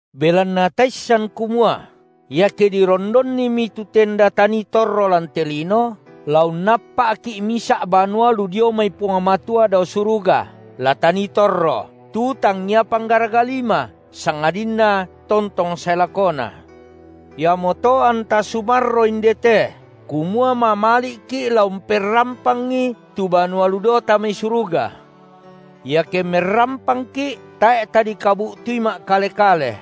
Belanna taissan kumua iake dirondonnimi tu tenda tanii torro lan te lino, la unnappa’ki’ misa’ banua lu dio mai Puang Matua dao suruga, la tanii torro, tu tangngia panggaraga lima, sangadinna tontong sae lakona. Iamoto anta sumarro indete kumua mamali’ki’ la umperrampangi tu banua lu daota mai suruga. Iake merrampangki’, tae’ tadikabu’tui ma’kale-kale.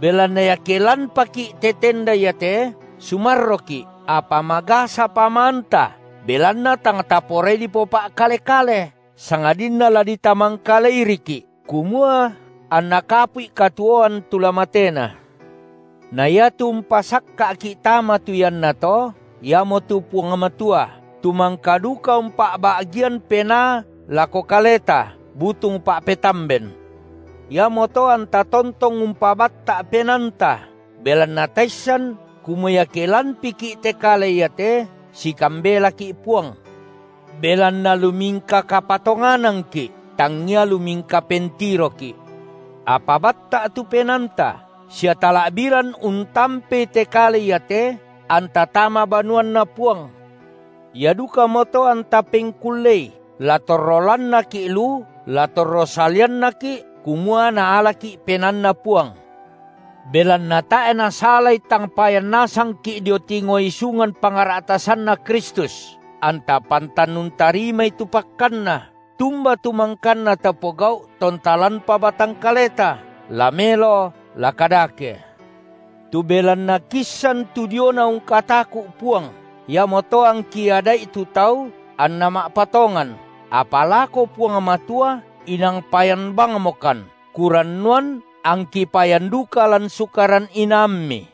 Belanna iake lanpaki’ te tenda iate, sumarroki’, apa magasa pamaanta, belanna tang taporai dipopa’kale-kale, sangadinna la ditamangkaleiriki’, kumua anna kapu’i katuoan tu la matena. Na iatu umpasakka’ki’ tama tu iannato, iamotu Puang Matua, tu mangka duka umpa’ba’gian Penaa lako kaleta butung pa’petamben. Iamoto anta tontong umpabatta’ penaanta, belanna taissan kumua iake lanpiki’ te kale iate, sikambelaki’ Puang. Belanna lumingka kapatonganangki’, tangngia lumingka pentiroki’. Apa batta’ tu penaanta sia tala’biran untampei te kale iate, anta tama banuanNa Puang. Ia dukamoto anta pengkullei, la torro lannaki’ lu, la torro saliannaki’, kumua Naalaki’ penaanNa Puang. Belanna tae’ nasalai tang payan nasangki’ dio tingo isungan pangra’tasanNa Kristus, anta pantan untarimai tu pakkanna, tumba tu mangkanna tapogau’ tonta lanpa batang kaleta, la melo la kadake. Tu belanna kiissan tu diona ungkataku’ Puang, iamoto angki ada’i tu tau anna ma’patongan, apa lako Puang Matua inang payan bangmokan, kurannuan angki payan duka lan sukaran inaammi.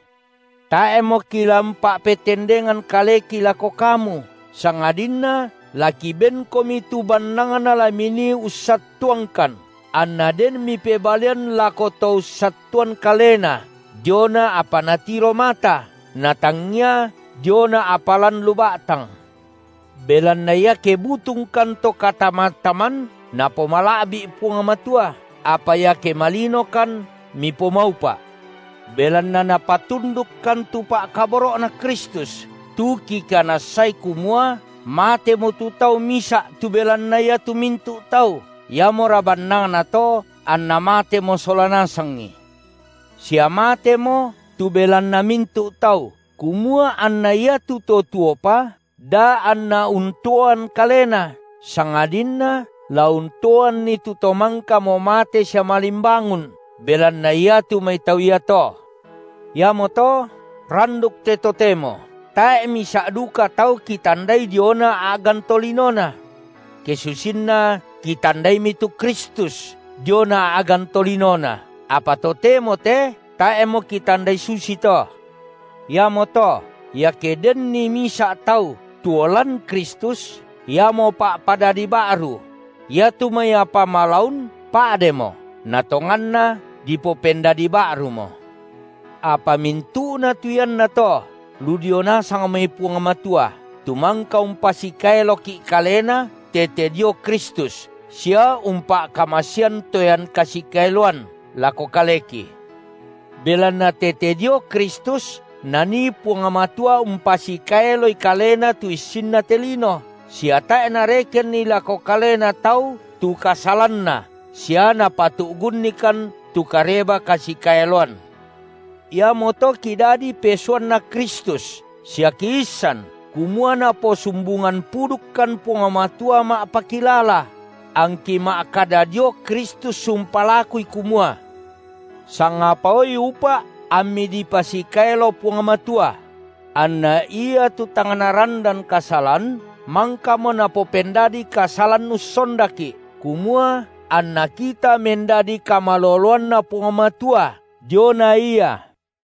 Tae’mo kila umpa’petendengan kaleki lako kamu, sangadinna la kibenkomi tu bannangna la minii ussattuangkan, anna den mipebalian lako to ussattuan kalena diona apa natiro mata, na tangngia diona apa lan lu ba’tang. Belanna iake butungkan to katamataman, napomala’bi’ Puang Matua, apa iake malinokan mipomaupa’. Belanna napatundukkan tu pa’kaboro’Na Kristus, tu kikanassai kumua matemo tu Tau misa’ tu belanna iatu mintu’ tau, iamora bannangnato anna matemo sola nasangi. Sia mateMo tu belanna mintu’ tau, kumua anna iatu to tuopa, da anna untuoan kalena, sangadinna la untuoanni tu To mangkamo mate sia malimbangun belanna iatu mai tau iato. Iamoto randuk te totemo tae’ misa’ duka tau kitandai diona a’gan tolinona. Ke susinna kitandaimi tu Kristus diona a’gan tolinona, apa totemo te tae’mo kitandai susito. Iamoto iake denni misa’ tau tuo lan Kristus, iamo pa’padadi ba’ru; iatu mai apa malaun pa’demo; na tonganna dipopendadi ba’rumo. Apa mintu’na tu iannato lu dio nasang mai Puang Matua, tu mangka umpasikaeloki’ Kalena tete dio Kristus sia umpa’kamasean toean kasikaeloan lako kaleki. Belanna tete dio Kristus Nanii Puang Matua umpasikaeloi Kalena tu issinna te lino, sia tae’ Narekenni lako kalena tau tu kasalanna sia Napatu’gunnikan tu kareba kasikaeloan. Iamoto kidadi pesuanNa Kristus sia kiissan, kumua Naposumbungan pudukkan Puang Matua ma’pakilala; angki ma’kada dio Kristus umpalakui kumua: Sangapaoi upa’ ammi dipasikaelo Puang Matua! Anna Ia tu tang narandan kasalan, mangkamo Napopendadi kasalan ussondaki’, kumua anna kita mendadi kamaloloanNa Puang Matua diona Ia.